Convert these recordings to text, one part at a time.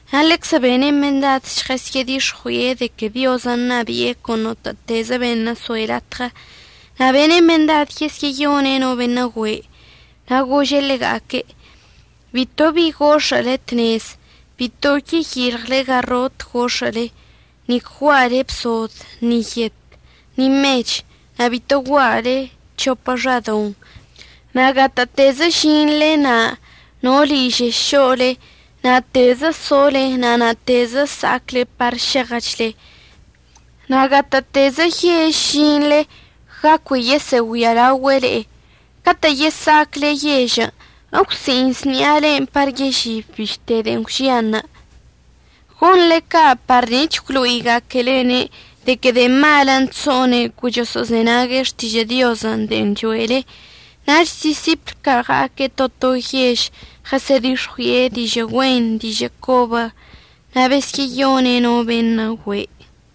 Na' ḻeczə bene' mendad žɉəsə'ədix̱ɉui'e de que Diozən' ṉabi'e con notə'ətezə beṉə' soe' latɉə. Na' bene' mendad yesyə'əyone' no beṉə' güe'. Na' gože' ḻega'aque': ―Bito bi gox̱ə'əle tnezən'. Bito yeyilɉle garot gox̱ə'əle, nic gua'ale bsod, ni yet, ni mech, na' bito gua'ale c̱hopə xadoṉ. Na' gatə'ətezə əžinḻe na' no ližei šo'ole, na'atezə sole na' na'atezə əsa'acle par šeɉəchle. Na' gatə'ətezə yež əžinḻe ga cui yesə'əgüialaogüe' le'e, catə' yesa'acle yežən' əgwsi'iṉs ṉi'alen' par yežib bište de'en gwžianṉə'. Gonḻe ca' par nic̱h əgwlo'iga'aquelene' de que de'e malən' chso'one' cui choso'ozenague' xtižə' Diozən' de'en cho'ele. Nach disipl ca' ɉa'aque' to to yež, ɉəsə'ədix̱ɉui'e dižə' güen dižə' cobən' na' besyə'əyone' no beṉə' güe'.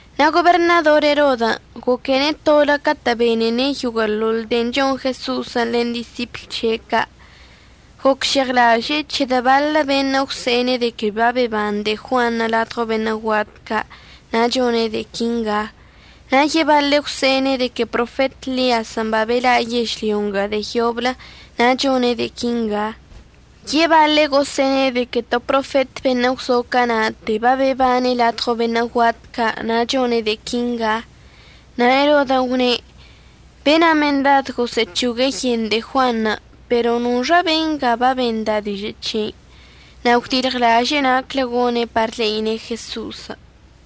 Na' goberṉador Erodən' goquene' tolə catə' benene' yoguə'əḻoḻ de'en chon Jeso'osən' len disipl c̱he' ca'. Gocžeɉlaže'e c̱hedə' baḻə beṉə' gwse'ene' de que babeban de'e Juanṉə' ladɉo beṉə' guat ca' na' chone' de'e quinga. Na' yebaḻe' gwse'ene' de que profet Ḻiazən' babela' yežlyo nga de'e yoblə na' chone' de'e quinga. Yebaḻe' gosə'əne' de que to profet beṉə' gwzo cana'ate babebane' ladɉo beṉə' guat ca' na' chone' de'e quinga. Na' Erodən' gwne': ―Bena' mendad gosə'əc̱hogue' yen de'e Juanṉə', pero ¿noxa benga babenda' dižə' c̱hei? Na' gwdilɉlaže'e naclə gone' par le'ine' Jeso'osən'.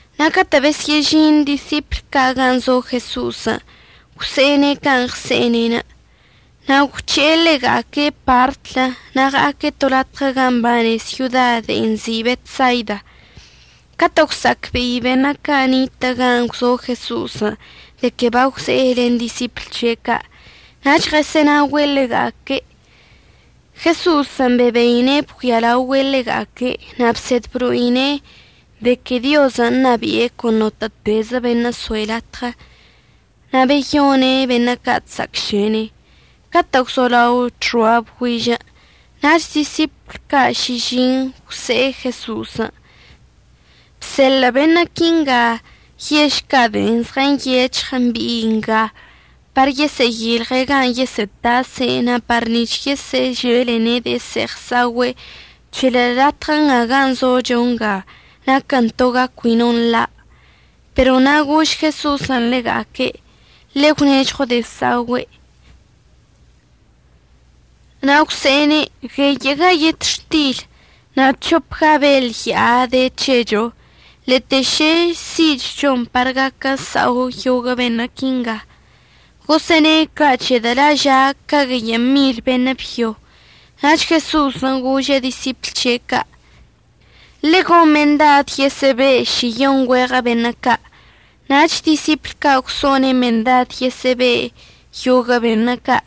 Na' catə' besyə'əžin disipl ca' gan' zo Jeso'osən' gwse'ene' can' ɉse'ene'enə'. Na' gwc̱he'e ḻega'aque' partlə na' ɉa'aque' to latɉə gan' mbane syoda de'en nzi' Betsaida. Catə' gwsa'acbe'i beṉə' ca' nitə' gan' gwzo Jeso'osən' de que bagwze'e len disipl c̱he' ca' nach ɉəsə'ənaogüe' ḻega'aque'. Jeso'osən' bebeine' bgüialaogüe' ḻega'aque' na' bsed blo'ine' de que Diozən' ṉabi'e con notə'ətezə beṉə' soe' latɉə. Na' beyone' beṉə' ca' chsa'acšene. Catə' gwzolao chxoa bgüižən' nach disipl ca' šižiṉ gwse'e Jeso'osən': ―Bseḻə' beṉə' quinga yež ca' de'en nyec̱hɉ mbi'i nga par yesə'əyilɉe' gan' yesə'ətase' na' par nic̱h yesə'əželene' de'e se'eɉ əsa'ogüe' c̱hedə' latɉə gan' zocho nga naquən to ga cui no nḻa'. Pero na' gož Jeso'osən' ḻega'aque': ―Ḻe'e gwnežɉo de'e sa'ogüe'. Na' gwse'ene': ―Gueyə'əga yetxtil na' c̱hopga beḻ ya'a de c̱hecho. Lete šə si'ichchon par gaquen əsa'o yoguə' beṉə' quinga. Gosə'əne' ca' c̱hedə' la' ža' ca gueyə' mil beṉə' byo. Nach Jeso'osən' gože' disipl c̱he' ca': ―Le'e gon mendad yesə'əbe' šiyon güeɉə beṉə' ca'. Nach disipl ca' gwso'one' mendad yesə'əbe' yoguə' beṉə' ca'.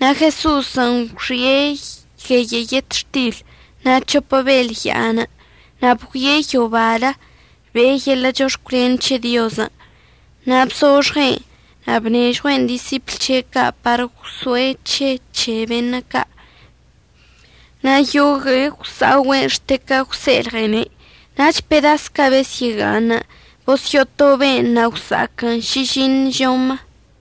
Na' Jeso'osən' gwxi'e gueyə' yetxtilən' na' c̱hopə beḻ ya'anə', na' bgüie' yobalə be'e yeḻə' chox̱cwlen c̱he Diozən', na' bzoxɉe'en na' bnežɉue'en disipl c̱he' ca' par gwso'e c̱he c̱he beṉə' ca'. Na' yogue'e gwsa'ogüe'en xte ca gwse'elɉene'. Nach pedas ca' besyə'əga'aṉən' bosyo'otobe'en, na' gwsa'aquən šižiṉ žomə.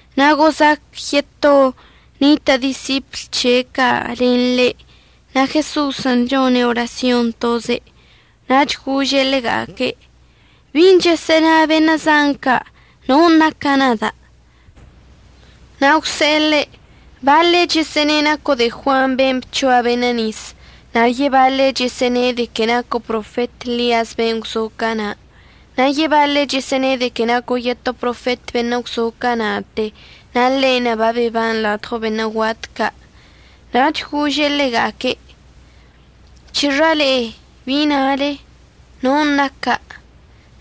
Na' gozac yeto nitə' disipl c̱he' ca' len ḻe' na' Jeso'osən' chone' orasyon toze'. Nach gože' ḻega'aque': ―¿Bin' chəsə'əna beṉə' zan ca', non' naca' nada'? Na' gwse'e ḻe': ―Baḻe' chəsə'əne' naco' de'e Juan ben' bc̱hoa beṉə' nis, na' yebaḻe' chəsə'əne' de que naco' profet Ḻiazən' ben' gwzo cana', na' yebaḻe' chəsə'əne' de que naco' yeto profet beṉə' gwzo cana'ate na' ḻe'enə' babeban ladɉo beṉə' guat ca'. Nach gože' ḻega'aque': ―¿C̱hexa le'e? ¿bi nale? ¿non' naca'?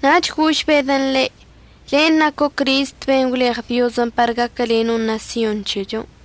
Nach gož Bedən' ḻe': ―Len' naco' Crist ben' gwleɉ Diozən' par gaquəleno' ṉasyon c̱hechon'.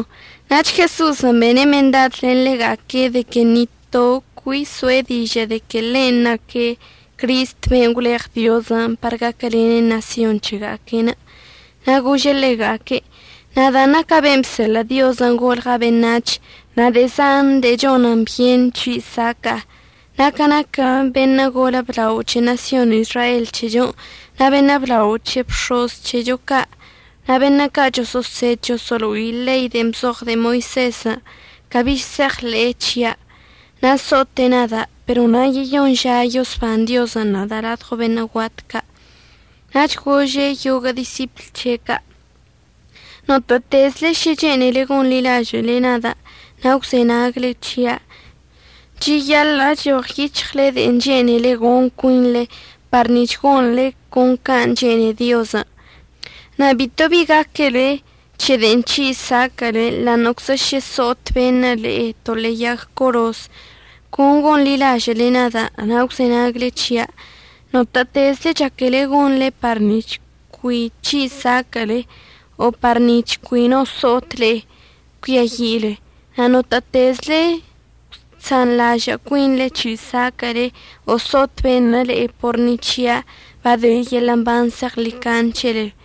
Nach Jeso'osən' bene' mendad len ḻega'aque' de que ni toe' cui əso'e dižə' de que ḻen' naque' Cristən' ben' gwleɉ Diozən' par gaquəlene' ṉasyon c̱hega'aque'enə'. Na' gože' ḻega'aque': ―Nadan' naca' ben' bseḻə' Diozən' golɉa' beṉac̱h. Na' de'e zan de'e chonən byen c̱hi' saca'a. Na' ca naquə beṉə' golə blao c̱he ṉasyon Izrael c̱hechon' na' beṉə' blao c̱he bx̱oz c̱hecho ca' na' beṉə' ca' choso'osed choso'olo'i ḻei de'en bzoɉ de'e Moisezən', cabi se'eɉḻe'e c̱hia', na' so'ote' nada', pero na' yeyoṉ ža yosban Diozən' nada' ladɉo beṉə' guat ca'. Nach gože' yoguə' disipl c̱he ca': ―Notə'ətezle šə chene'ele gonḻilažə'əle nada' na' gwzenagle c̱hia', cheyaḻə' əchoɉyic̱hɉle de'en chene'ele gon cuinḻe par nic̱h gonḻe con can' chene'e Diozən', na' bito bi gaquele c̱he de'en c̱hi' saquə'əle, ḻa'aṉə'əczə šə so'ot beṉə' le'e to ḻe'e yag coroz, con gonḻilažə'əle nada' na' gwzenagle c̱hia'. Notə'ətezle chaquele gonḻe par nic̱h cui c̱hi' saquə'əle o par nic̱h cui no so'ot le'e, cuiayi'ile. Na' notə'ətezle chsanḻažə' cuinḻe c̱hi' saquə'əle o so'ot beṉə' le'e por ni c̱hia' bade yeḻə' mban zeɉḻicaṉe c̱hele.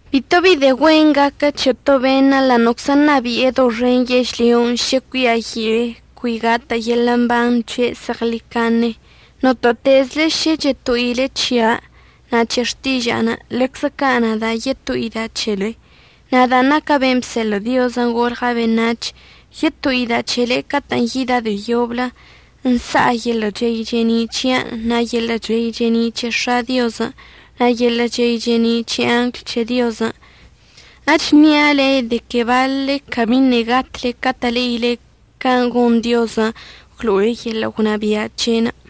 Bito bi de'e güen gaquə c̱he to beṉə' ḻa'aṉə'əczə ṉabi'e doxen yežlyon' šə cuiayi'e cui gatə' yeḻə' mban c̱he' zeɉḻicaṉe. Notə'ətezle šə cheto'ile c̱hia' na' c̱he xtiža'anə', ḻeczə ca' nada' yeto'ida' c̱hele, nadan' naca' ben' bseḻə' Diozən' golɉa' beṉac̱h. Yeto'ida' c̱hele catə'ən yida' de'e yoblə nsa'a yeḻə' chey che'eni' c̱hia'anə' na' yeḻə' chey che'eni' c̱he X̱a' Diozən', na' yeḻə' chey che'eni' c̱he angl c̱he Diozən'. Echnia' de que baḻle cabiṉə' gatle catə' le'ile can' gon Diozən' əgwlo'e yeḻə' gwnabia' c̱he'enə'.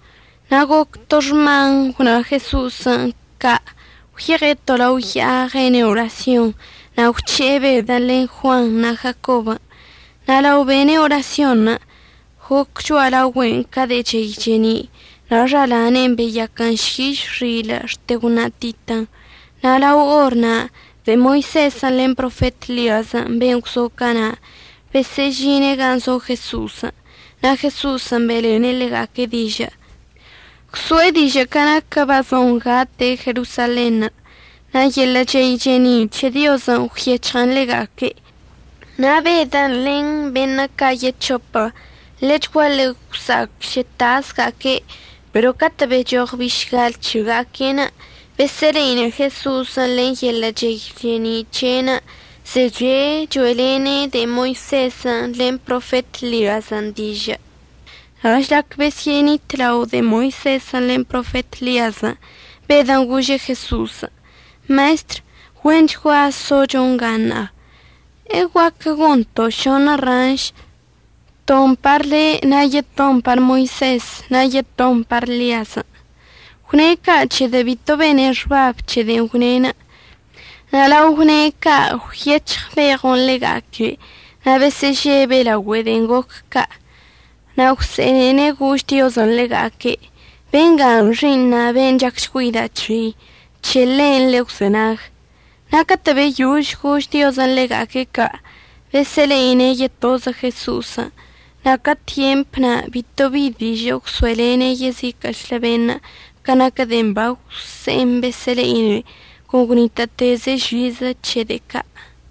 Na' goc to xman gwna Jeso'osən' ca', gwyeɉe' to lao ya'a ɉene' orasyon, na' gwc̱he'e Bedən' len Juanṉə' na' Jacobən'. Na' lao bene' orasyonṉə' goc cho'alaogüe'enə' ca de'e chey che'eni', na' xalane'enə' beyaquən šyiš xilə' xte gwṉatitən. Na' lao or na' de'e Moisezən' len profet Ḻiazən' ben' gwzo cana' besyə'əžine' gan' zo Jeso'osən' na' Jeso'osən' be'elene' ḻega'aque' dižə'. Gwso'e dižə' ca naquən' bazon gate' Jerosalenṉə'. Na' yeḻə' chey che'eni' c̱he Diozən' gwyec̱hɉən ḻega'aque'. Na' Bedən' len beṉə' ca' yec̱hopə ḻechguaḻe gwsa'ac šə tasga'aque'. Pero catə' bechoɉ bišgal c̱hega'aque'enə' besə'əle'ine' Jeso'osən' len yeḻə' chey che'eni' c̱he'enə', zeche' cho'elene' de'e Moisezən' len profet Ḻiazən' dižə'. Na' žlac besyə'əṉitlao de'e Moisezən' len profet Ḻiazən', Bedən' gože' Jeso'osən': ―Maestr, güenchgua zocho nga ṉa'a. ¿Eguaquə gonto' šoṉə ranš, ton par le', na' yeton par Moisezən', na' yeton par Ḻiazən'? Gwne' ca' c̱hedə' bito bene' xbab c̱he de'en gwne'. Na' lao gwne' ca' gwyec̱hɉ beɉon' ḻega'aque' na' besə'əžebe' laogüe de'en goc ca'. Na' gwse'enene' gož Diozən' ḻega'aque': ―Bengan' xi'iṉa', ben' chacchgüeida' c̱hei. C̱he ḻe'enə' ḻe'e gwzenag. Na' catə' beyož gož Diozən' ḻega'aque' ca', besə'əle'ine' yetozə Jeso'osən'. Na' ca tyemp na' bitobi dižə' gwso'elene' yeziquə'əchlə beṉə' ca naquə de'en bagwse'en besə'əle'ine'enə'. Con gwnitə'əteze' žizə c̱he de'e ca'.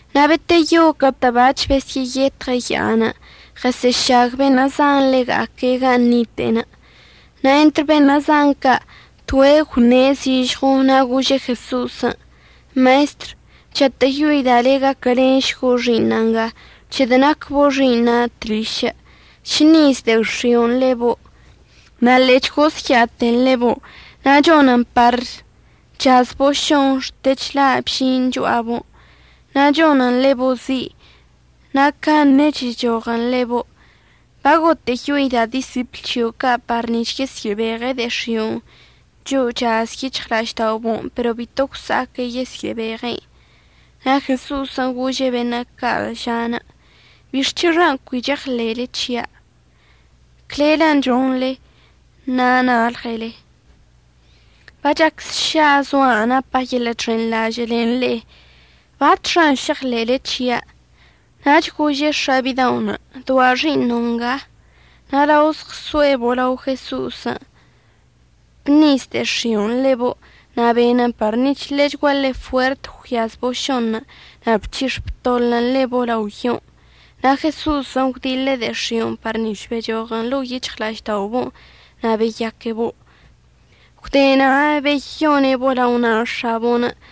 Na' beteyo catə' bac̱h besyə'əyetɉe' ya'anə', ɉəsə'əšag beṉə' zan ḻega'aque' gan' nite'enə'. Na' entr beṉə' zan ca' toe' gwṉe' zižɉo na' gože' Jeso'osən': ―Maestr, chatə'əyoida' le' gaquəlenšgo' xi'iṉa' nga, c̱hedə' nacbo' xi'iṉa' tlišə'. Chṉiz de'e x̱i'onə' ḻebo', na' ḻe'e chgosya'aten ḻebo', na' chonen par chazbo' šon xte chla' bžin' cho'abo', na' chonən ḻebo' zi', na' caṉe chechoɉən' ḻebo'. Bagotə'əyoida' disipl c̱hio' ca' par nic̱h yesyə'əbeɉe' de'e x̱i'onə' cho'o chaz yic̱hɉla'ažda'obo'onə', pero bito gwsa'aque' yesyə'əbeɉe'en. Na' Jeso'osən' gože' beṉə' ca' ža'anə': ―¿Bixc̱hexan' cui cheɉḻe'ele c̱hia'? Clellən' chonḻe na' nalɉele. Bachac sša zoa' napa' yeḻə' chxenḻažə' len le'e. ¿Batxan' šeɉḻe'ele c̱hia'? Nach gože' x̱a bida'onə': ―Doa' xi'iṉo' nga. Na' lao zɉso'ebo' lao Jeso'osən' bṉiz de'e x̱i'onə' ḻebo', na' benən par nic̱h ḻechguaḻe fuert gwyazbo' šonṉə', na' bchix̱ btoḻən ḻebo' lao yon'. Na' Jeso'osən' gwdiḻe' de'e x̱i'onə' par nic̱h bechoɉən ḻo'o yic̱hɉla'ažda'obo'onə' na' beyaquebo'. Gwde na' beyone'ebo' lao na' x̱abo'onə'.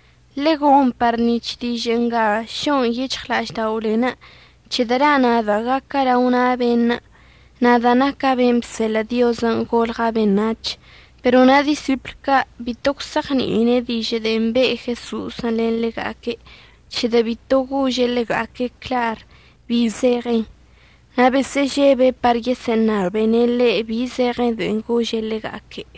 ―Ḻegon par nic̱h dižə' nga šo'on yic̱hɉla'ažda'olen', c̱hedə' la' nada' gaca' lao na' beṉə', nadan' naca' ben' bseḻə' Diozən' golɉa' beṉac̱h. Pero na' disipl ca' bito gwse'eɉni'ine' dižə' de'en be' Jeso'osən' len ḻega'aque', c̱hedə' bito gože' ḻega'aque' clar bi zeɉen, na' besə'əžebe' par yesə'əṉabene' ḻe' bi zeɉen de'e gože' ḻega'aque'.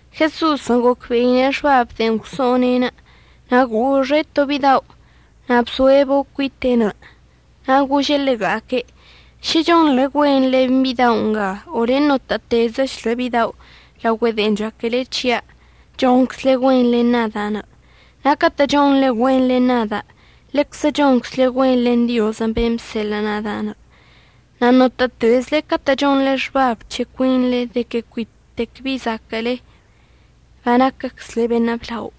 Jeso'osən' gocbe'ine' xbab de'en gwso'one'enə' na' goxe' to bidao' na' bso'ebo' cuite'enə'. Na' gože' ḻega'aque': ―Šə chonḻe güen len bidao' nga o len notə'ətezəchlə bidao' laogüe de'en chaquele c̱hia', chonczle güen len nada'anə'. Na' catə' chonḻe güen len nada', ḻeczə chonczle güen len Diozən' ben' bseḻə' nada'. Na' notə'ətezle catə' chonḻe xbab c̱he cuinḻe de que cuitec bi zaquə'əle, banaquəczle beṉə' blao.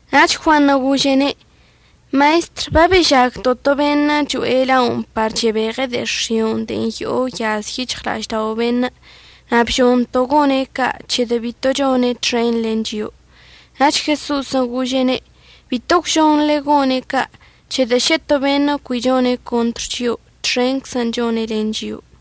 Nach Juanṉə' gože'ene': ―Maestr, babežagto' to beṉə' cho'e la'onə' par chebeɉe' de'e x̱io' de'en yo'o yaz yic̱hɉla'aždao' beṉə', na' bžonto' gone' ca' c̱hedə' bito chone' txen len chio'o. Nach Jeso'osən' gože'ene': ―Bito gwžonḻe gone' ca' c̱hedə' šə to beṉə' cui chone' contr chio'o, txenczən' chone' len chio'o.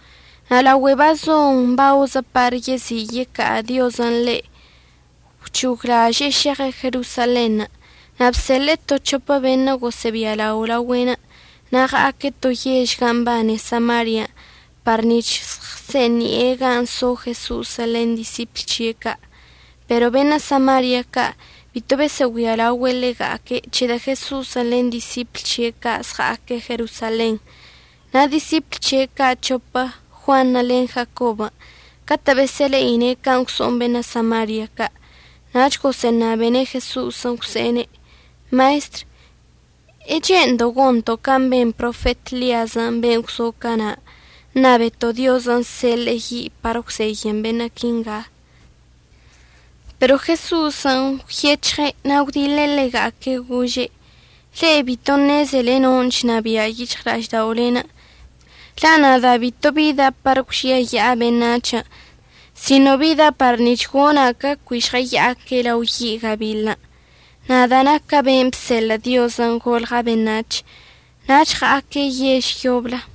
Na' laogüe bazon baozə par yezi' yeca'a Diozən' ḻe', gwc̱hoglaže'e šeɉe' Jerosalenṉə'. Na' bseḻe'e to c̱hopə beṉə' gosə'əbialao laogüe'enə'. Na' ɉa'aque' to yež gan' mbane Samarian' par nic̱h žɉəsə'əsi'ini'e gan' so Jeso'osən' len disipl c̱he' ca'. Pero beṉə' Samaria ca' bito besə'əgüialaogüe' ḻega'aque', c̱hedə' Jeso'osən' len disipl c̱he' ca' chɉa'aque' Jerosalenṉə'. Na' disipl c̱he' ca' c̱hopə, Juanṉə' len Jacobən', catə' besə'əle'ine' can' gwso'on beṉə' Samaria ca' nach gosə'əṉabene' Jeso'osən' gwse'ene': ―Maestr, ¿əche'endo' gonto' can' ben profet Ḻiazən' ben' gwzo cana', əṉabeto' Diozən' əseḻe'e yi' par əgwzeyən beṉə' quinga? Pero Jeso'osən' gwyec̱hɉe' na' gwdiḻe' ḻega'aque' gože': ―Le'e bito ṉezele non' chnabia' yic̱hɉla'ažda'olen'. La' nada' bito bida' par əgwžiayi'a beṉac̱hən', sino bida' par nic̱h gona' ca cui žɉəya'aque' lao yi' gabiḻən', nadan' naca' ben' bseḻə' Diozən' golɉa' beṉac̱h. Nach ɉa'aque' yež yoblə.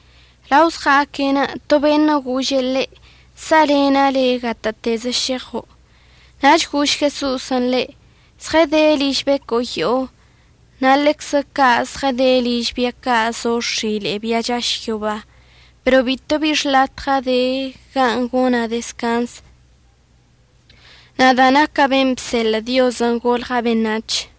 Lao zɉa'aque'enə' to beṉə' gože' ḻe': ―Sa'alena' le' gatə'ətezə šeɉo'. Nach gož Jeso'osən' ḻe': ―Zɉəde liž becoyo'o ca' na' ḻeczə ca' zɉəde liž bia ca' zo x̱ile'e bia chaš yoba, pero bito bi xlatɉa' de gan' gona' dezcanz, nadan' naca' ben' bseḻə' Diozən' golɉa' beṉac̱h.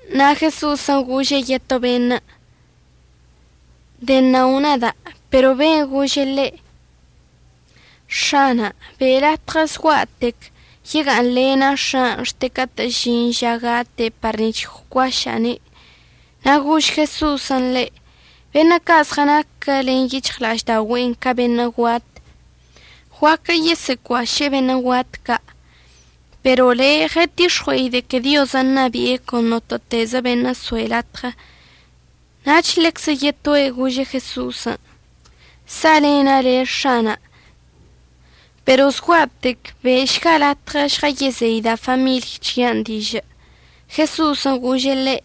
Na' Jeso'osən' gože' yeto beṉə': ―Denao nada'. Pero be'enə' gože' ḻe': ―X̱ana' be' latɉə zgua'atec yega'aṉlena' x̱a'anə' xte catə' əžin ža gate' par nic̱h əgwcuaša'ane'. Na' gož Jeso'osən' ḻe': ―Beṉə' ca' zɉənaquə len yic̱hɉla'ažda'oga'aquen' ca beṉə' guat guaquə yesə'əcuaše'e beṉə' guat ca'. Pero le' ɉətix̱ɉue'e de que Diozən' ṉabi'e con notə'ətezə beṉə' soe' latɉə. Nach ḻeczə yetoe' gože' Jeso'osən': ―Sa'alena' le' X̱ana', pero zgua'atec be'ešga latɉə žɉəyezeida' famiḻy c̱hia' dižə'. Jeso'osən' gože' ḻe':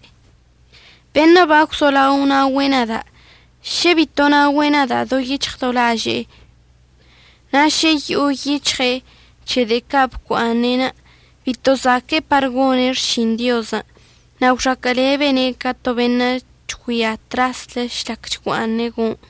―Beṉə' bagwzolao naogüe' nada' šə bito naogüe' do yic̱hɉ do laže'e, na' šə yo'o yic̱hɉe' c̱he de'e ca' bocua'aṉe', bito zaque'e par gone' xšin Diozən'. Na' gwxaquə'əlebene' ca to beṉə' chgüia traslə žlac chgua'aṉe' go'oṉ.